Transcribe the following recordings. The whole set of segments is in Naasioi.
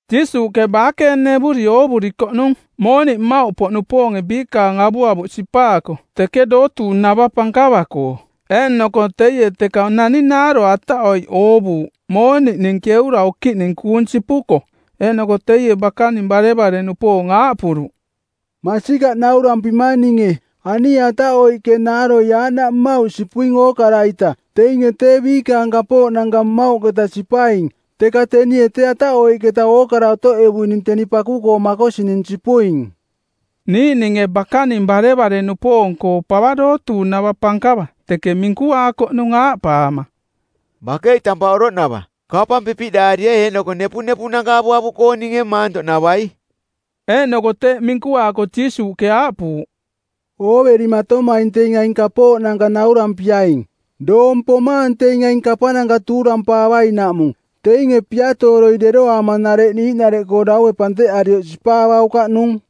Jiisuuꞌke baakeenevuri oovurikoꞌnung mooniꞌ mmauꞌpoꞌnupoonge biikaang avuavuꞌ sipaako teke dootuuꞌnava pankava-koo. Eeꞌnoko teie teka nani naaro ataꞌoiꞌ oovuuꞌ mooniꞌning keura okiꞌning kuung sipuko. Eeꞌnoko teie bakaning barevare-nupoong aaꞌpuruꞌ, “Masikaꞌ naurampimang ninge, anie ataꞌoiꞌke naaroi aaꞌnaꞌ mmauꞌ sipuing ookara-ita. Teinge tee biikaang kapooꞌnanka mmauꞌketa sipaing, teka tenie tee ataꞌoiꞌketa ookara otoꞌevuining teni paku-koo makosining sipuing.” Niiꞌninge bakaning barevare-nupoong-koo pava dootuuꞌnava pankava teke minkuaakoꞌnung aaꞌpaama, “Bakei tampaꞌ oroꞌnava, kapang pipiꞌdaarie eeꞌnoko nepunepuꞌnanka avuavuꞌkooninge maantoꞌnavai.” Eeꞌnoko teeꞌ minkuaako Jiisuuꞌke aaꞌpuuꞌ, “Ooverimatomaing teing aing kapooꞌnanka naurampiaing: Doong pomaang teing aing kapananka tuurampaavainaꞌmung. Teinge piatooroi deroaama nareꞌ niiꞌnareꞌkoo daue panteꞌarioꞌ sipaavaukaꞌnung.”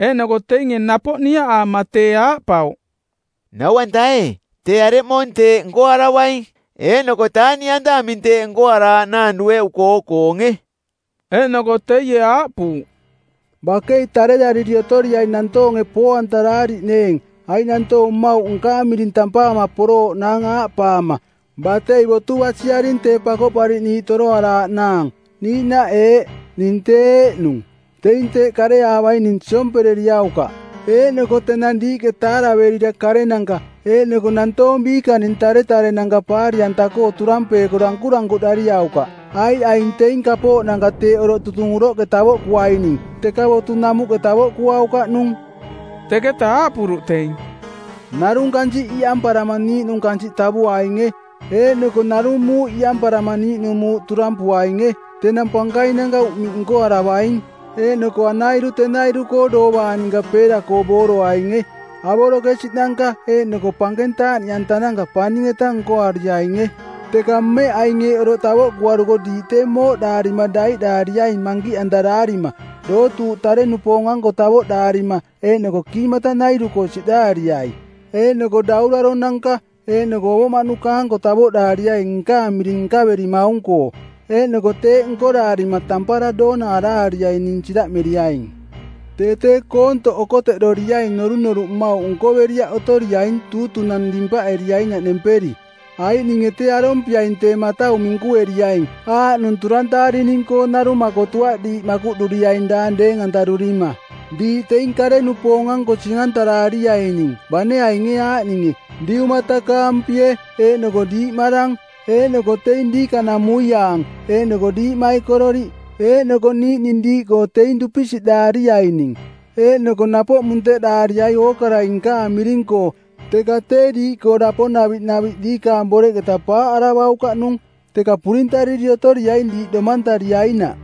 Eeꞌnoko teinge napoꞌ niaꞌaama tee aaꞌpauꞌ, “Nau-anta ee, tee areꞌmoong teeꞌ nkoaravaing? Eeꞌnoko taaꞌniꞌanta aming teeꞌ nkoaraaꞌnaang dueꞌuko oo-koonge?” Eeꞌnoko teie aaꞌpuuꞌ, “Bakei tarerariri otoriaing nantoonge poo-antaraariꞌneeng, aiꞌ nantoong mmauꞌ nkaang miring tampaama porooꞌnaang aaꞌpaama, ‘Batei botu basiaring Tee Pakoꞌpariꞌniiꞌ toroaraaꞌnaang.’ Niiꞌnaꞌ eeꞌ, ‘Ning tee eeꞌnung.’ Teing teeꞌ kareavaining siompereriaukaꞌ. Eeꞌnoko tenang diiꞌke taaraverira karenanka eeꞌnoko nantoong biikaning taretarenanka paari-anta-koo turampeeko dankurankuꞌdariaukaꞌ, aiꞌ aing teing kapooꞌnanka teeꞌ oroꞌ tutung uroꞌke tavoꞌkuaining, teka botu namuꞌke tavoꞌkuaukaꞌnung.” Teketaꞌ aaꞌpuruꞌ teing, “Narung kansiꞌ iꞌamparama niiꞌnung kansiꞌ tavuainge, eeꞌnoko narung muuꞌ iꞌamparama niiꞌnung muuꞌ turampuainge. Tenang pankainanka uꞌmiꞌ nkoaravaing, eeꞌnoko anairu tenairu-koo doovang ninka peera-koo booroainge. Avorokesiꞌnanka eeꞌnoko pankeng taaꞌniꞌantananka paning-eta nkoariainge. Teka mmeꞌ aing eeꞌ oroꞌ tavoꞌkuaruko diiꞌ tee mooꞌdaarima daiꞌdaariaing mankiꞌantaraarima, dootuuꞌ tare-nupoong-anko tavoꞌdaarima eeꞌnoko kiimatanairu-koo siꞌdaariai. Eeꞌnoko dauraronanka eeꞌnoko ovoꞌmaꞌnuka-anko tavoꞌdaariai nkaang miring nkaverimaung-koo. Eeꞌnoko teeꞌ nkoraarima tampara doona araariai ning siraꞌmeriaing. Tee tee koontoꞌ okoteꞌdoriaing norunoruꞌ mmauꞌ nkoveriaꞌ otoriaing tuutunang˜ nimpaꞌeriainaꞌ nemperi. Aiꞌ ninge tee arompiaing tee matau minkueriaing aaꞌnung turantaarining-koo narung makotuaꞌ diiꞌ makuꞌduriaing daang deeng-antarurima. Diiꞌ teing kare-nupoong-anko sing-antaraariaining bane ainge aaꞌninge: diumatakaampie eeꞌnoko diiꞌmarang eeꞌnoko teing diikanamuiaang eeꞌnoko diiꞌmaikororiꞌ eeꞌnoko niiꞌning diiꞌkoo teing dupisiꞌdaariaining. Eeꞌnoko napoꞌ munteꞌdaariai ookarai nkaang miring-koo. Teka tee diiꞌkoo daponaviꞌ naviꞌ diikaang boreꞌketa paaꞌaravaukaꞌnung. Teka purintariri otoriaing diiꞌ domantariainaꞌ.”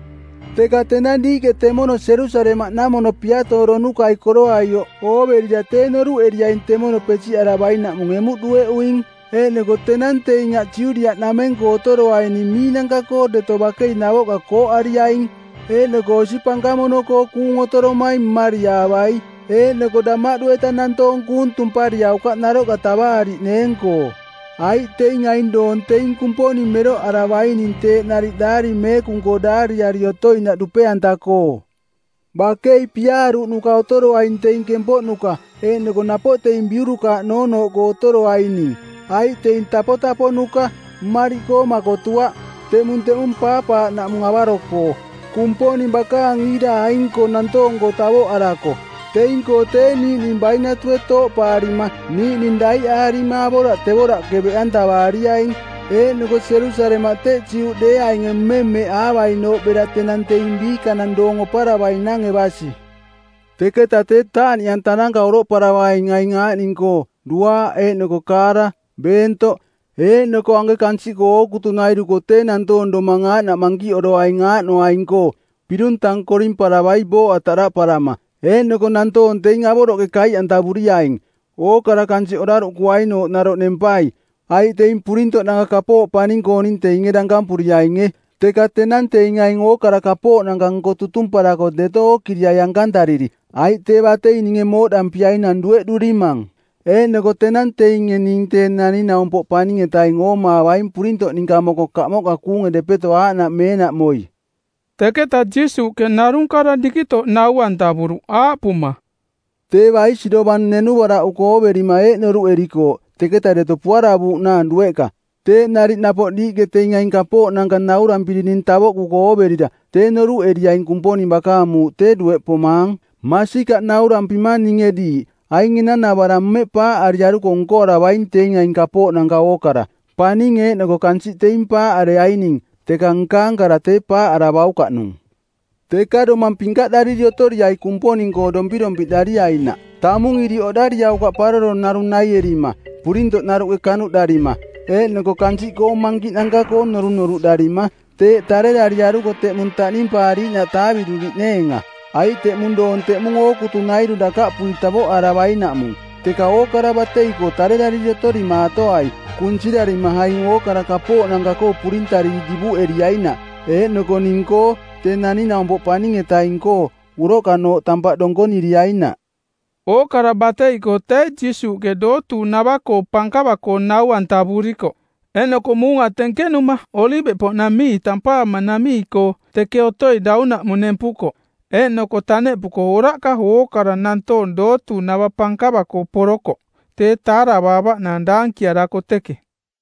“Teka tenang diiꞌke temono Jerusalemaꞌnamono piatooronukai koroaioꞌ ooverira tee noruꞌeriaing temono pesiꞌaravainaꞌmung emuꞌ dueꞌuing. Eeꞌnoko tenang teing aꞌ Judiaꞌnameng-koo otoroaining miinanka-koo deto bakei navoꞌka kooꞌariaing! Eeꞌnoko osi pankamono-koo kuung otoromaing mmariaavai, eeꞌnoko damaꞌdu-eta nantoong kuung tumpariaukaꞌ naroꞌka tavaariꞌneeng-koo. Aiꞌ teing aing doong teing Kumponing meroꞌaravaining teeꞌ nariꞌ Daari Meekung-koo daariari otoinaꞌ dupe-anta-koo. Bakei piaaruꞌnuka otoroaing teing kempoꞌnuka eeꞌnoko napoꞌ teing biurukaaꞌ noonooꞌkoo otoroaining, aiꞌ teing tapotaponuka, mmariꞌkoo makotuaꞌ. Teꞌmung teꞌmung paapaaꞌnaꞌmung avaro-koo, Kumponing bakaang iira aing-koo nantoong-koo tavoꞌarako. Teing-koo tee niiꞌning bainatue tooꞌpaarima niiꞌning daiꞌaarima avoraꞌtevoaraꞌke beꞌantavaariaing. Eeꞌnoko Jerusalemaꞌ teꞌ Juꞌdeeainge mmemmeꞌaavainooꞌ bera tenang teing biikanang doong oparavainange basi.” “Teketa tee taaꞌniꞌantananka oroꞌparavaing aing aaꞌning-koo duaaꞌ eeꞌnoko kaara, beentoꞌ. Eeꞌnoko anke kansiꞌkoo ookutunairu-koo tee nantoong domang aaꞌnaꞌ mankiꞌoroaing aaꞌnoaing-koo pirung tang korimparavai booꞌa taꞌdaꞌparama. Eeꞌnoko nantoong teing avoroꞌke kaiꞌantavuriaing, ookara kansiꞌ oraruꞌkuainooꞌ naroꞌ nempai. Aiꞌ teing purintoꞌnanka kapooꞌ paning-kooning teinge dankampuriaininge. Teka tenang teing aing ookara kapooꞌnanka nko tutumparako deto ookiriai ankantariri, aiꞌ tee batei ninge mooꞌdampiainang dueꞌdurimang; Eeꞌnoko tenang teinge ning Tee Naning-naumpoꞌ Paning-etaing oomaavaing purintoꞌ ninka moko kamoꞌka kuunge depeto aaꞌnaꞌ meenaꞌmoi.” Teketa Jiisuuꞌke narung kara dikitoꞌ nau-antavuruꞌ, aaꞌpuma, “Tee baisi dovang nenuvaraꞌuko ooverima eeꞌ noruꞌerikooꞌ teketa deto puaravuuꞌnaang dueꞌka. Teeꞌ nariꞌ napoꞌ diiꞌke teing aing kapooꞌnanka naurampirining tavoꞌkuko ooverira tee noruꞌeriaing Kumponing bakaang muuꞌ tee dueꞌ pomaang. Masikaꞌ naurampimang ninge diiꞌ, aing enanavarang mmeꞌ paaꞌariaruko nkoaravaing teing aing kapooꞌnanka ookara. Paning eeꞌnoko kansiꞌ teing paaꞌareaining, teka nkaang kara tee paaꞌaravaukaꞌnung. “Teka domang pinkaꞌdariri otoriai Kumponing-koo dompirompiꞌdariainaꞌ. Tamung iriꞌ oꞌdariaukaꞌ paroro narung naierima, purintoꞌnaruꞌke kanuꞌdarima, eeꞌnoko kansiꞌkoong mankiꞌnanka-koo norunoruꞌdarima, teeꞌ tarerariaruko teꞌmung taꞌnimpaariiꞌnaꞌ taaviꞌduriꞌneenga. Aiꞌ teꞌmung doong teꞌmung ookutunairu dakaꞌpui tavoꞌaravainaꞌmung. Teka ookara batei-koo tanatarariri otorimaatoai, kunsirarima aing ookara kapooꞌnanka-koo purintariri divuꞌeriainaꞌ eeꞌnoko ning-koo, Tee Naning-naumpoꞌ Paning-etaing-koo, uroꞌkanooꞌ tampaꞌ donkoniriainaꞌ.” Ookara batei-koo tee Jiisuuꞌke Dootuuꞌnava-koo Pankava-koo nau-antavurikoꞌ, eeꞌnoko muunga tenkenuma Oliveꞌpoꞌnamii tampaamanamii-koo teke otoi daunaꞌmung nempukoꞌ. Eeꞌnoko taneꞌpuko oraꞌka ookara nantoong dootuuꞌnava pankava-koo porokoꞌ tee taaravaavaꞌnaang daankiarako teke.